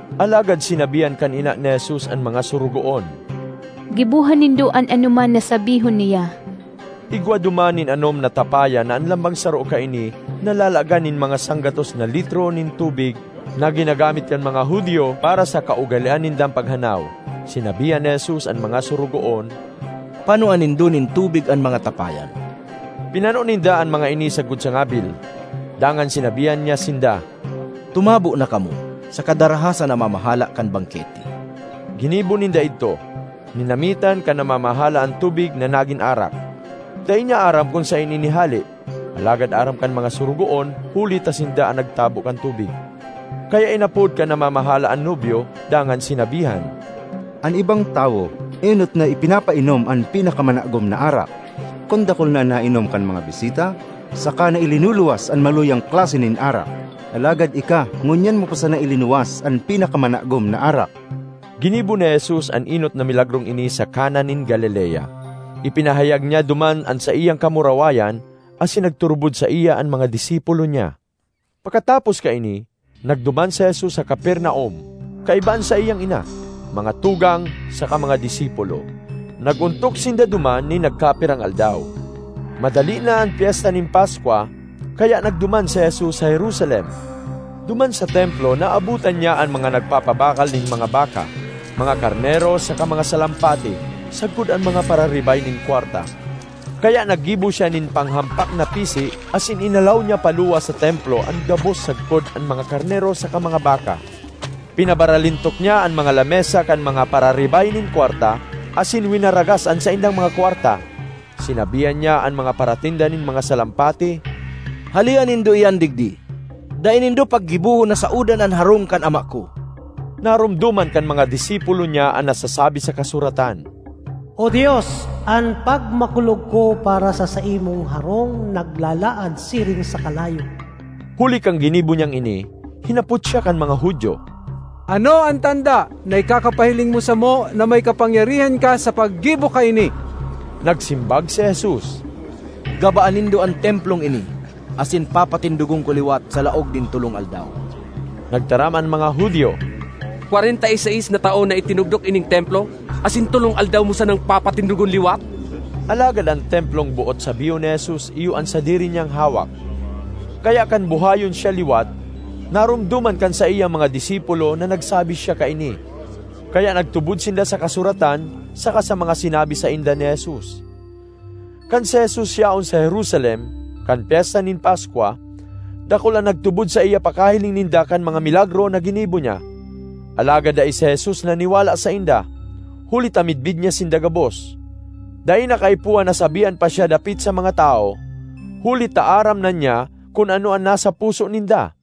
Alagad sinabihan kan ina ni Jesus an mga sorogoon, “Giboha nindo an anoman na sabihon niya.” Igwa duman nin anom na tapayan na an lambang saro kaini nalalagan nin mga sanggatos na litro nin tubig na ginagamit kan mga Judio para sa kaugalean nindang paghanaw. Sinabihan ni Jesus an mga sorogoon, “Panoa nindo nin tubig an mga tapayan.” Pinano ninda an mga ini sagkod sa ngabil. Dangan sinabihan niya sinda, “Tumabo na kamo saka daraha sa namamahala kan bangkete.” Ginibo ninda idto. Ninamitan kan namamahala an tubig na nagin arak; dai niya aram kun saen ini hale, (alagad aram kan mga sorogoon huli ta sinda an nagtabo kan tubig.) Kaya inapod kan namamahala an nobyo dangan sinabihan, “An ibang tawo enot na ipinapainom an pinakamanagom na arak. Kun dakul na an nainom kan mga bisita, saka na ilinuluwas an maluyang klase nin arak. Alagad ika, ngunyan mo pa sana ilinuwas an pinakamanagom na arak!” Ginibo ni Jesus an enot na milagrong ini sa Cana nin Galilea; ipinahayag niya duman an saiyang kamurawayan asin nagturubod saiya an mga disipulo niya. Pakatapos kaini, nagduman si Jesus sa Capernaum, kaiba an saiyang ina, mga tugang, saka mga disipulo. Nag-ontok sinda duman nin nagkapirang aldaw. Madali na an Pyesta nin Paskwa, kaya nagduman si Jesus sa Jerusalem. Duman sa Templo naabotan niya an mga nagpapabakal nin mga baka, mga karnero, saka mga salampati, sagkod an mga pararibay nin kwarta. Kaya naggibo siya nin panghampak na pisi asin inalaw niya paluwas sa Templo an gabos sagkod an mga karnero saka mga baka. Pinabaralintok niya an mga lamesa kan mga pararibay nin kwarta asin winaragas an saindang mga kwarta. Sinabihan niya an mga paratinda nin mga salampati, “Halea nindo iyan digdi! Dai nindo paggibohon na saodan an harong kan Ama ko!” Naromdoman kan mga disipulo niya an nasasabi sa kasuratan, “O Dios, an pagmakulog ko para sa saimong harong naglalaad siring sa kalayo.” Huli kan ginibo niyang ini, hinapot siya kan mga Judio, “Ano an tanda na ikakapahiling mo samo na may kapangyarihan ka sa paggibo kaini?” Nagsimbag si Jesus, “Gabaa nindo an Templong ini, asin papatindogon ko liwat sa laog nin tolong aldaw.” Nagtaram an mga Judio, “Kwarenta y seis na taon na itinugdok ining Templo, asin tolong aldaw mo sanang papatindogon liwat?” Alagad an Templong boot sabihon ni Jesus iyo an sadiri niyang hawak. Kaya kan buhayon siya liwat, naromdoman kan saiyang mga disipulo na nagsabi siya kaini, kaya nagtubod sinda sa kasuratan saka sa mga sinabi sainda ni Jesus. Kan si Jesus yaon sa Jerusalem, kan Pyesta nin Paskwa, dakul an nagtubod saiya pakahiling ninda kan mga milagro na ginibo niya. Alagad dai si Jesus naniwala sainda, huli ta midbid niya sinda gabos. Dai na kaipuhan na sabihan pa siya dapit sa mga tawo, huli ta aram na niya kun ano an nasa puso ninda.